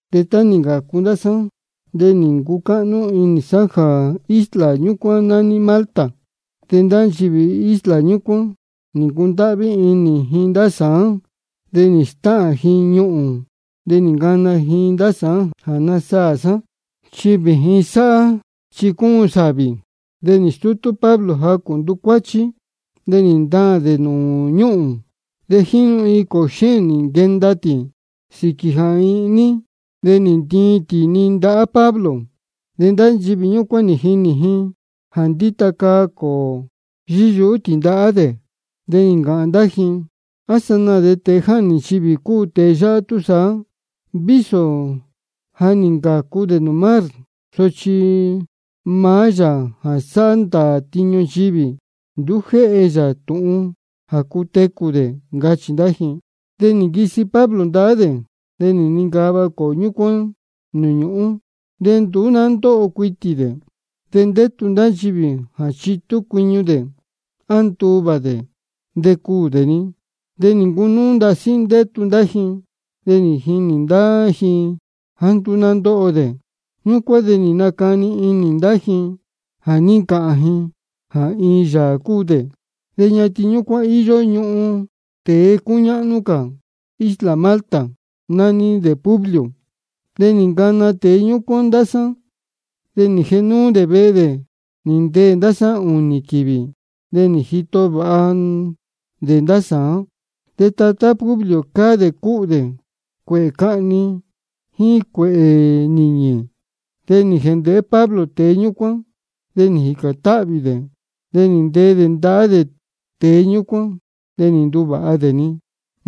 De tá nī ncācu ndá sá de nī ncucáhnú inī sá jā isla ñúcuán nání Malta. De ndá nchivī isla ñúcuán nī ncundáhví inī ji ndá sāán, de nī stáhān ji iin ñuhūn de nī ncana ji ndá sāán jā nasaā sá, chi vījin sáhá chi cúun sāvī. De nī stútú Pablo jacū ntucuáchí, de nī ntaān dē nūū ñúhūn. De jínu iin cōō xéēn nī nquee tī sīquī jā ihní, de nī ntiin tī-ni ndahá Pablo. De ndá nchivī ñúcuán nī jinī ji jā ndíta caa cōō yíyuhú tī ndahá dē, de nī ncāhān ndá ji: A sanaā de tēe jáhnī ndīyi cúu tēe yáhá túsaá, de vísō ja nī ncācu dē nūū mar sochi maá yāā jā sáhá ndāā tiñu nchivī, nduú jéhe yā tūhun jā cutecū cā dē, ncachī ndá ji. De nī nquisi Pablo ndahá dē, de nī nincava cōō ñúcuán nūū ñúhūn, de nduú ná ndóho cuitī dē. De ndétu ndá nchivī jā chitú cuiñu dē á jā nduvā dē de cuū dē-ni. De nī ncunúú ndasí ndétu ndá ji, de nī jinī ndá ji jāá nduú ná ndóho dē. Ñúcuán de nī nacani inī ndá ji, de nī ncāhān ji jā iin yāā cúu dē. De ñatin ñúcuán íyó ñuhun tēe cúñáhnú cā isla Malta, nání dē Publio. De nī ncana tēe ñúcuán ndá sá, de nī jēhe núú dē vehe dē nī ndeē ndá sá ūnī quīvī, de nī jito vāha dē ndá sāán. De tatá Publio cáá dē cúhū dē cuēhē cahni jíín cuēhē nīñī. De nī jēndēhé Pablo tēe ñúcuán, de nī jīcān táhvī dē, de nī ntee dē ndahá dē tēe ñúcuán, de nī nduvāha dē-ni.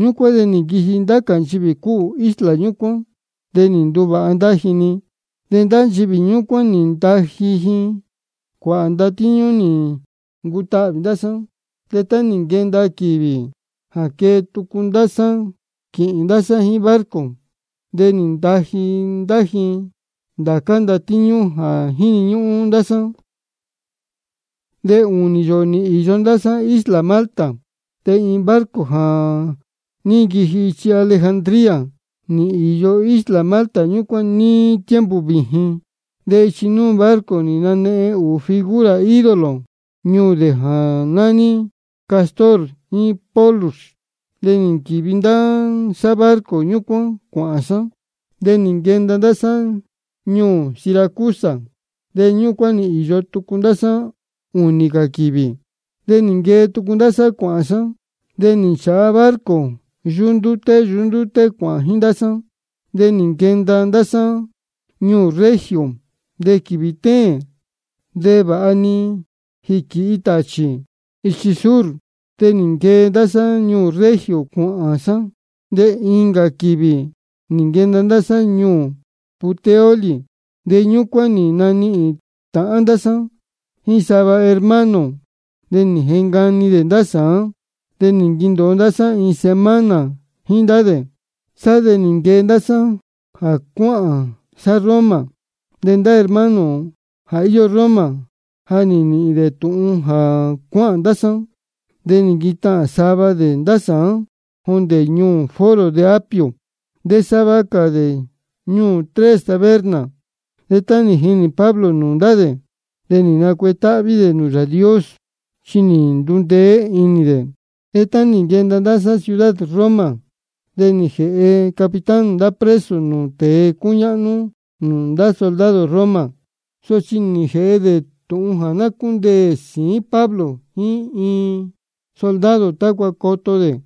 Ñúcuán de nī nquiji ndá cā nchivī cúhū isla ñúcuán, de nī nduvāha ndá ji-ni. De ndá nchivī ñúcuán nī ntaji ji cuāhā ndatíñú nī ncutahvī ndá sá. De tá nī nquenda quīvī jā quee tucu ndá sá quīhīn sá jíín barco, de nī ntaji ndá ji ndācá ndatíñú jā jíni ñúhún ndá sá. De ūnī yōō nī īyo ndá sá isla Malta. De iin barco jā ní nquiji ichi Alejandría nī īyo isla Malta ñúcuán níí tiempo vījin. De ichi núū barco nī nanehen dē ūū figura ídolo ñuū dē jā nání Cástor jíín Pólux. De nī nquīvi ndá sá barco ñúcuán cuāhān sá. De nī nquenda ndá sá ñuū Siracusa, de ñúcuán nī īyo tucu ndá sá ūnī cā quīvī. De nī nquee tucu ndá sá cuāhān sá, de nī nchāha barco yuhú ndúté yuhú ndúté cuāhān jíín ndá sá, de nī nquenda ndá sá ñuū Regio. De quīvī téēn de vāha nī jīquīhi tāchī ichi sur, de nī nquee ndá sá ñuū Regio cuāhān sá, de incā quīvī nī nquenda ndá sá ñuū Puteoli. De ñúcuán nī nanihīn tāhán ndá sá jíín sava hermano. De nī jecani dē ndá sá de nī nquendōo ndá sá iin semana jíín ndá dē. Sá de nī nquee ndá sá jā cuáhān sá Roma. De ndá hermano jā íyó Roma, ja nī nīhīn dē tūhun jā cuáhān ndá sá, de nī nquitahān sava dē ndá sāán jondē ñuū Foro de Apio, de sava cā dē ñuū Tres Tabernas. De tá nī jinī Pablo nūū ndá dē de nī nacuetáhví dē nūū Yāā Dios, chi nī ndundeé inī dē. De tá nī nquenda ndá sá ciudad Roma de nī jēhe capitán ndá preso nūū tēe cúñáhnú nūū ndá soldado Roma. Sochi nī jēhe dē tūhun jā ná cúndeē sīín Pablo jíín iin soldado tácua coto dē.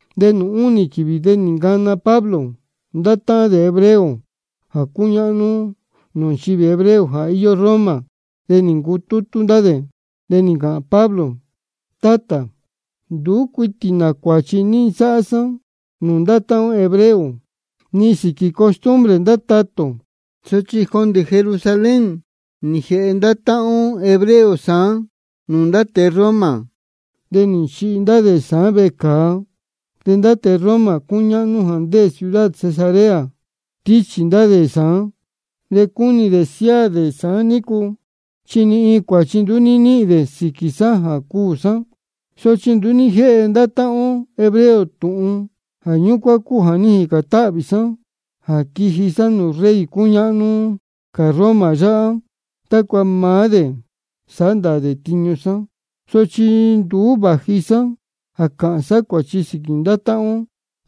De nūū únī quīvī de nī ncana Pablo ndá táhán dē hebreo jā cúñáhnú nūū nchivī hebreo jā íyó Roma, de nī ncutútú ndá dē. De nī ncāhān Pablo: Tátā, nduú cuitī nā cuāchi ní nsáhá sá nūū ndá táhán ó hebreo ni sīquī costumbre ndá tatā ō. Sochi jondē Jerusalén nī jēhe ndá táhán ó hebreo sāán nūū ndá tēe Roma, de nī nchihi ndá dē sāán vecāa. De ndá tēe Roma cúñáhnú jā ndéē ciudad Cesarea nī stíchī ndá dē sāán. De cúnī dē siáā dē sāán nícu, chi ni iin cuāchi nduú ní níhīn dē sīquī sá jā cuū sá. Sochi nduú ní jéhe ndá táhán ó hebreo tūhun. Jā ñúcuán cúu jā ní jīcān táhvī sá jā quiji sá nūū rey cúñáhnú cā Roma yáhá tácua maá dē sāhá ndāā tiñu sá. Sochi nduú vāji sá jā cāhān sá cuāchi sīquī ndá táhán ó.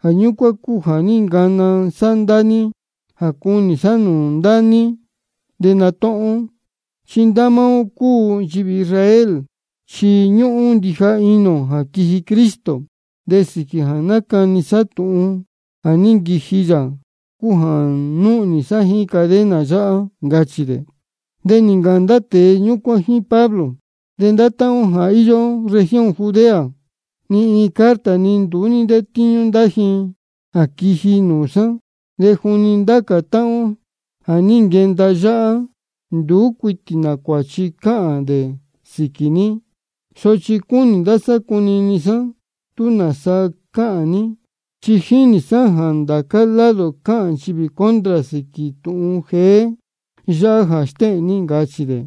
Jā ñúcuán cúu jā ní ncana sá ndá ní jā cunī sá nūū ndá ní de natúhún ó. Chi ndá máá ó jā cúu ó nchivī Israel chi ñúhún ndija inī ō jā quiji Cristo. De sīquī jā nácani sá tūhun jā ja nī nquiji yā cúu jā núhnī sá jíín cadena yáhá, ncachī dē. De nī ncāhān ndá tēe ñúcuán jíín Pablo: De ndá táhán ó jā íyó región Judea ni iin carta ní nduú ní ntétíñú ndá ji jā quiji nūū sá. De juni ndá cā táhán ó jā ní nquenda yáhá nduú cuitī nā cuāchi cáhān ndá dē sīquī ní. Sochi cúnī ndá sá cunini sá tūhun nāsa cāhān ní, chi ja jínī sá jā ndācá lado cáhān nchivī contra sīquī tūhun jeé yáhá jā stéhēn ní, ncachī dē.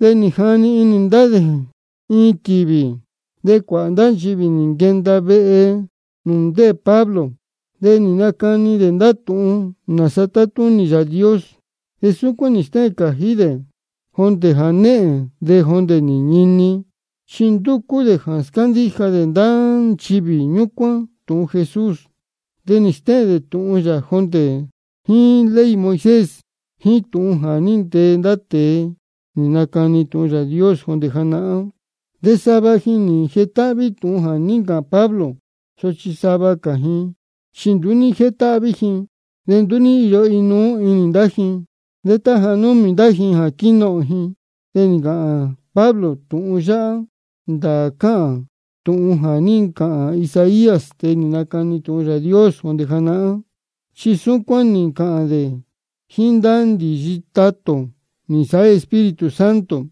De nī jani ndá dē iin quīvī, de cuāhā ndá nchivī nī nquenda vehe nūū ndéē Pablo. De nī nacani dē ndá tūhun nāsa tátúnī Yāā Dios. De súcuán nī stéhēn cājí dē jondē jānehēn de jondē nī ñini. Chi ndúcú dē jā scándíja dē ndá nchivī ñúcuán tūhun Jesús, de nī stéhēn dē tūhun yā jondē jíín ley Moisés jíín tūhun jā ní ntee ndá tēe nī nacani tūhun Yāā Dios jondē janahán. De sava ji nī jetáhví jā ní ncāhān Pablo, sochi sava cā ji chi nduú ní jétáhví ji. De nduú ní íyo inuú inī ndá ji. De tá ja númī ndá ji quīnohōn ji de nī ncāhān Pablo tūhun yáhá: Ndāā cáhān tūhun jā ní ncāhān Isaías, tēe nī nacani tūhun Yāā Dios jondē janahán, chi súcuán nī ncāhān dē jíín ndá ndīyi tatā ō nī nsāhá Espíritu Santo: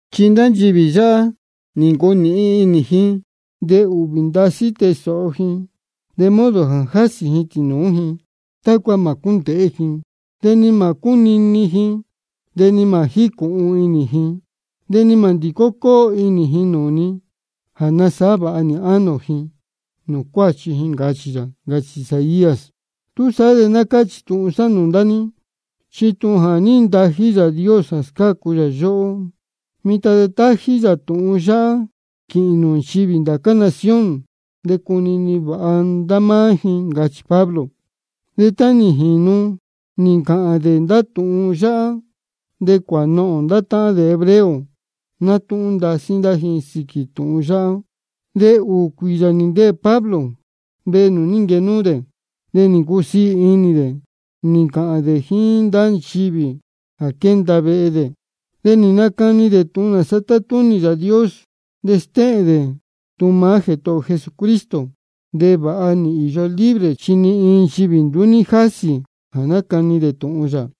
Chi ndá nchivī yáhá nī ncunīhin inī ji, de ūhvī ndasí tée sōho ji, de modo jā jásī ji tīnūú ji, tácua mā cúndēhé ji, de ni mā cúnini ji, de ni mā jícūhun inī ji, de ni mā ndīcó cóo inī ji nūū ni jā nasāhá vāha nī ánō ji nūū cuáchi ji, ncachī yā. Ncachī Isaías. Túsaá de ná cáchī tūhun sá nūū ndá ní, chi tūhun jā ní ntají Yāā Dios jā scácu yā yóhó, mitan de tají yā tūhun yáhá quīhīn nūū nchivī ndá cā nación, de cunini vāha ndá máá ji, ncachī Pablo. De tá nī jīnu nī ncāhān dē ndá tūhun yáhá de cuānohōn ndá táhán dē hebreo, nátúhún ndasí ndá ji sīquī tūhun yáhá. De ūū cuīyā nī ndeē Pablo vehe nūū ní nquenúú dē, de nī ncusiī inī dē nī ncāhān dē jíín ndá nchivī jā quénda vehe dē. De nácani dē tūhun nāsa tátúnī Yāā Dios, de stéhēn dē tūhun maá Jētohō ō Jesucristo, de vāha nī īyo libre chi ni iin nchivī nduú ní jásī jā nácani dē tūhun yā.